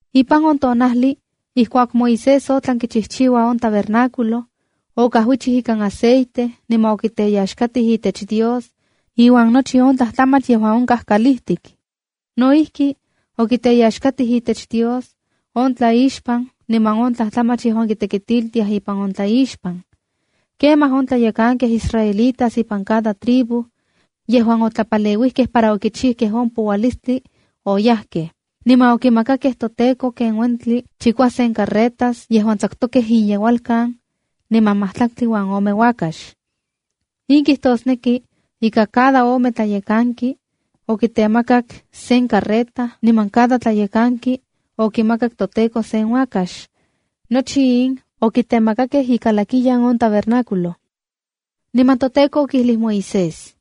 Ipan on tonajli ijkuak Moisés otlan kichijchiua on tabernáculo, okajuichij ikan aceite niman okiteyaxkatij itech Dios iuan nochi on tlajtlamach yejuan onkaj kalijtik. No ijki, okiteyaxkatij itech Dios on tlaixpan niman on tlajtlamach yejuan kitekitiltiaj ipan on tlaixpan. Kemaj on tlayekankej israelitas ipan cada tribu yejuan otlapaleuijkej para okichijkej on poualistli, niman okimakakej toTEKO ken uentli chikuasen carretas yejuan tsakutokej inyeualkan, niman majtlaktli uan ome uakax. In kijtosneki ika cada ome tlayekanki okitemakak sen carreta niman cada tlayekanki okimakak toTEKO sen uakax. Nochi in okitemakakej ikalakiyan on tabernáculo. Niman toTEKO okijlij Moisés: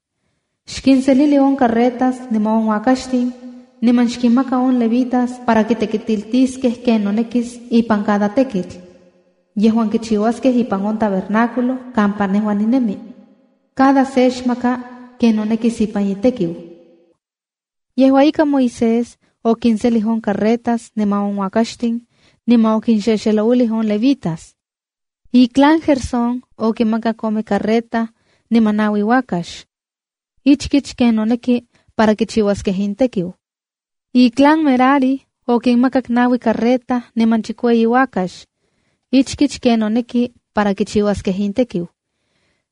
“Xkinselili on carretas niman on uakaxtin, niman xkinmaka on levitas para kitekitiltiskej ken nonekis ipan cada tekitl yejuan kichiuaskej ipan on tabernáculo kampa nejua ninemi. Cada se xmaka ken nonekis ipan itekiu.” Yejua ika, Moisés okinselij on carretas niman on uakaxtin, niman okinxexelouilij on levitas. Iclan Gersón okinmakak ome carreta niman naui uakax, ichkich ken noneki para kichiuaskej intekiu. Iclan Merari okinmakak naui carreta niman chikueyi uakax, ichkich ken noneki para kichiuaskej intekiu.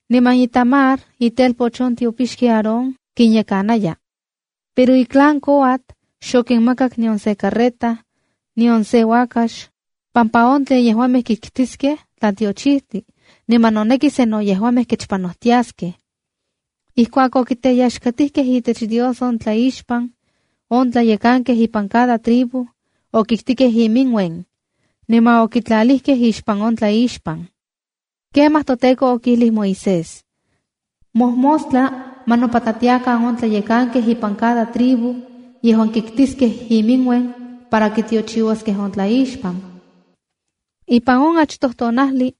Niman Itamar, itelpoch on tiopixki Aarón, kinyekanaya. Pero iclan Coat xokinmakak nion se carreta, nion se uakax, pampa on tlen yejuamej kiktiskej tlatiochijtli, niman noneki sa no yejuamej kechpanojtiaskej. Ijkuak okiteyaxkatikej itech Dios on tlaixpan, on tlayekankej ipan cada tribu okiktikej iminuen, niman okitlalijkej ixpan on tlaixpan. Kemaj toTEKO okijlij Moisés: “Mojmostla ma nopatlatiakan on tlayekankej ipan cada tribu yejuan kiktiskej iminuen para kitiochiuaskej on tlaixpan.” Ipan on achtoj tonajli,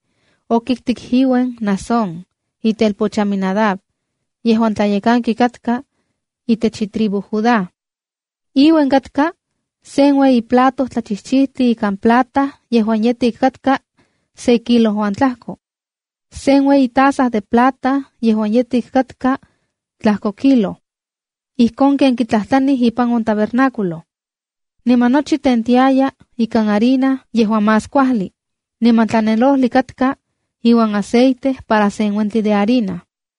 okiktik iuen Naasón, itelpoch Aminadab, yejuan tlayekanki katka itech itribu Judá. Inuen katka: sen ueyi plato tlachijchijtli ikan plata yejuan yetik katka se kilo uan tlajko, sen ueyi taza de plata yejuan yetik katka tlajko kilo, ijkon ken kitlajtlanij ipan on tabernáculo. Niman nochi tentiayaj ika harina yejuan más kuajli, niman tlanelojli katka iuan aceite para sen uentli de harina.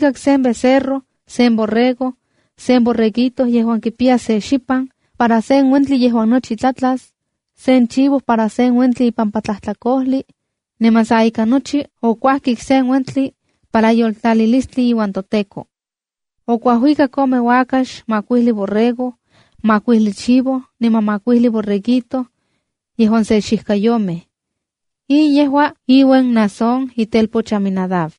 sen becerro, sen borrego, sen borreguito yejuan kipiya se xipan para sen uentli yejuan nochi tlatlas, sen chivo para sen uentli ipampa tlajtlakojli, niman sa ika nochi, okuajkik sen uentli para yoltlalilistli iuan toTEKO. Okuajuikak ome uakax, makuijli borrego, makuijli chivo niman makuijli borreguito yejuan se xijkayomej. In yejua iuen Naasón itelpoch Aminadab.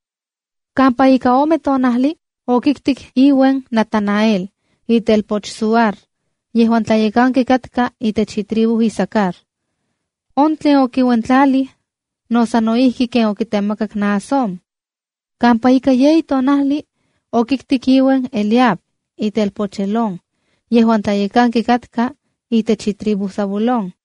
Kampa ika ome tonajli, okiktik iuen Natanael, itelpoch Zuar, yejuan tlayekanki katka itech itribu Isacar. On tlen okiuentlalij, no sano ijki ken okitemakak Naasón. Kampa ika yeyi tonajli okiktik iuen Eliab, itelpoch Helón, yejuan tlayekanki katka itech itribu Zabulón.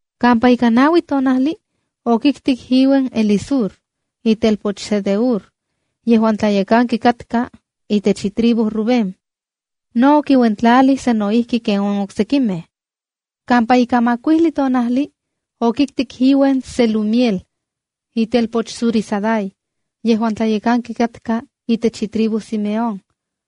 Kampa ika naui tonajli okiktik iuen Elisur, itelpoch Sedeur, yejuan tlayekanki katka itech itribu Rubén. No okiuentlalij sano ijki ken on oksekimej. Kampa ika makuijli tonajli, okiktik iuen Selumiel, itelpoch Zurisadai, yejuan tlayekanki katka itech itribu Simeón.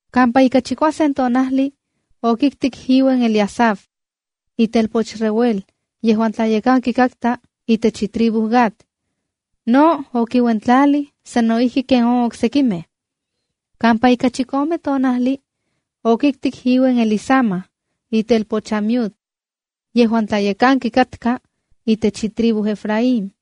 Kampa ika chikuasen tonajli, okiktik iuen Eliasaf, itelpoch Reuel, yejuan tlayekanki katka itech itribu Gad. No okiuentlalij sano ijki ken on oksekimej. Kampa ika chikome tonajli okiktik iuen Elisama, itelpoch Amiud, yejuan tlayekanki katka itech itribu Efraín.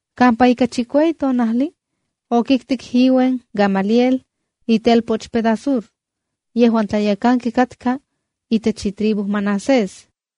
Kampa ika chikueyi tonajli okiktik iuen Gamaliel, itelpoch Pedasur yejuan tlayekanki katka itech itribu Manasés.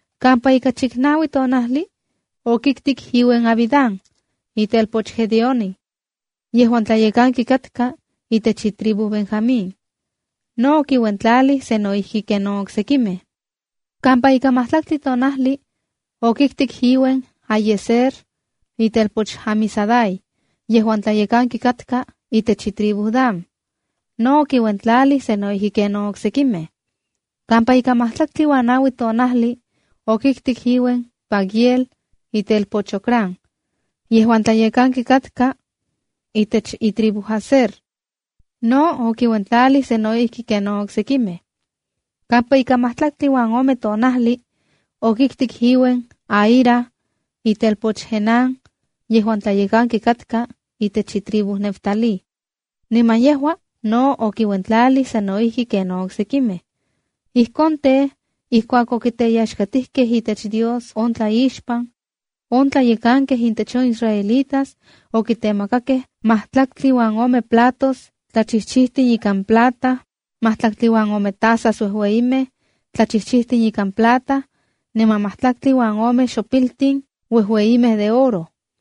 Kampa ika chiknaui tonajli okiktik iuen Abidán, itelpoch Gedeoni, yejuan tlayekanki katka itech itribu Benjamín. No okiuentlalij sano ijki ken on oksekimej. Kampa ika majtlaktli tonajli, okiktik iuen Ahiezer, itelpoch Amisadai, yejuan tlayekanki katka itech itribu Dan. No okiuentlalij sano ijki ken on oksekimej. Kampa ika majtlaktli uan se tonajli, okiktik iuen Pagiel, itelpoch Ocrán, yejuan tlayekanki katka itech itribu Aser. No okiuentlalij sano ijki ken on oksekimej. Kampa ika majtlaktli uan ome tonajli, okiktik iuen Ahira, itelpoch Enán, yejuan tlayekanki katka itech itribu Neftalí. Niman yejua no okiuentlalij sano ijki ken on oksekimej. Ijkon tej, ijkuak okiteyaxkatijkej itech Dios on tlaixpan, on tlayekankej intech on israelitas okitemakakej majtlaktli uan ome platos tlachijchijtin ikan plata, majtlaktli uan ome tasas uejueyimej tlachijchijtin ikan plata, niman majtlaktli uan ome xopiltin uejueyimej de oro.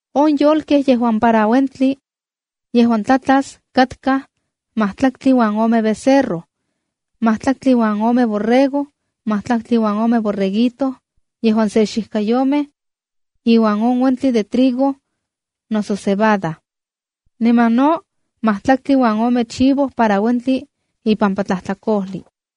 On yolkej yejuan para on uentli yejuan tlatlas katkaj majtlaktli uan ome becerro, maktlaktli uan ome borrego, majtlaktli uan ome borreguito yejuan se xijkayomej, iuan on uentli de trigo noso cebada. Niman no majtlaktli uan ome chivo para uentli ipampa tlajtlakojli.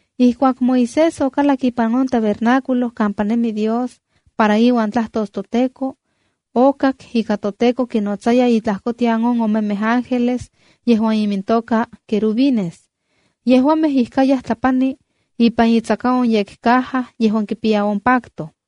Ijkuak Moisés okalak ipan on tabernáculo kampa nemi Dios para iuan tlajtos toTEKO, okak ika toTEKO kinotsaya intlajkotian on omemej ángeles yejuan imintoka querubines. Yejuamej ijkayaj tlapani ipan itsaka on yekcaja yejuan kipiya on pacto.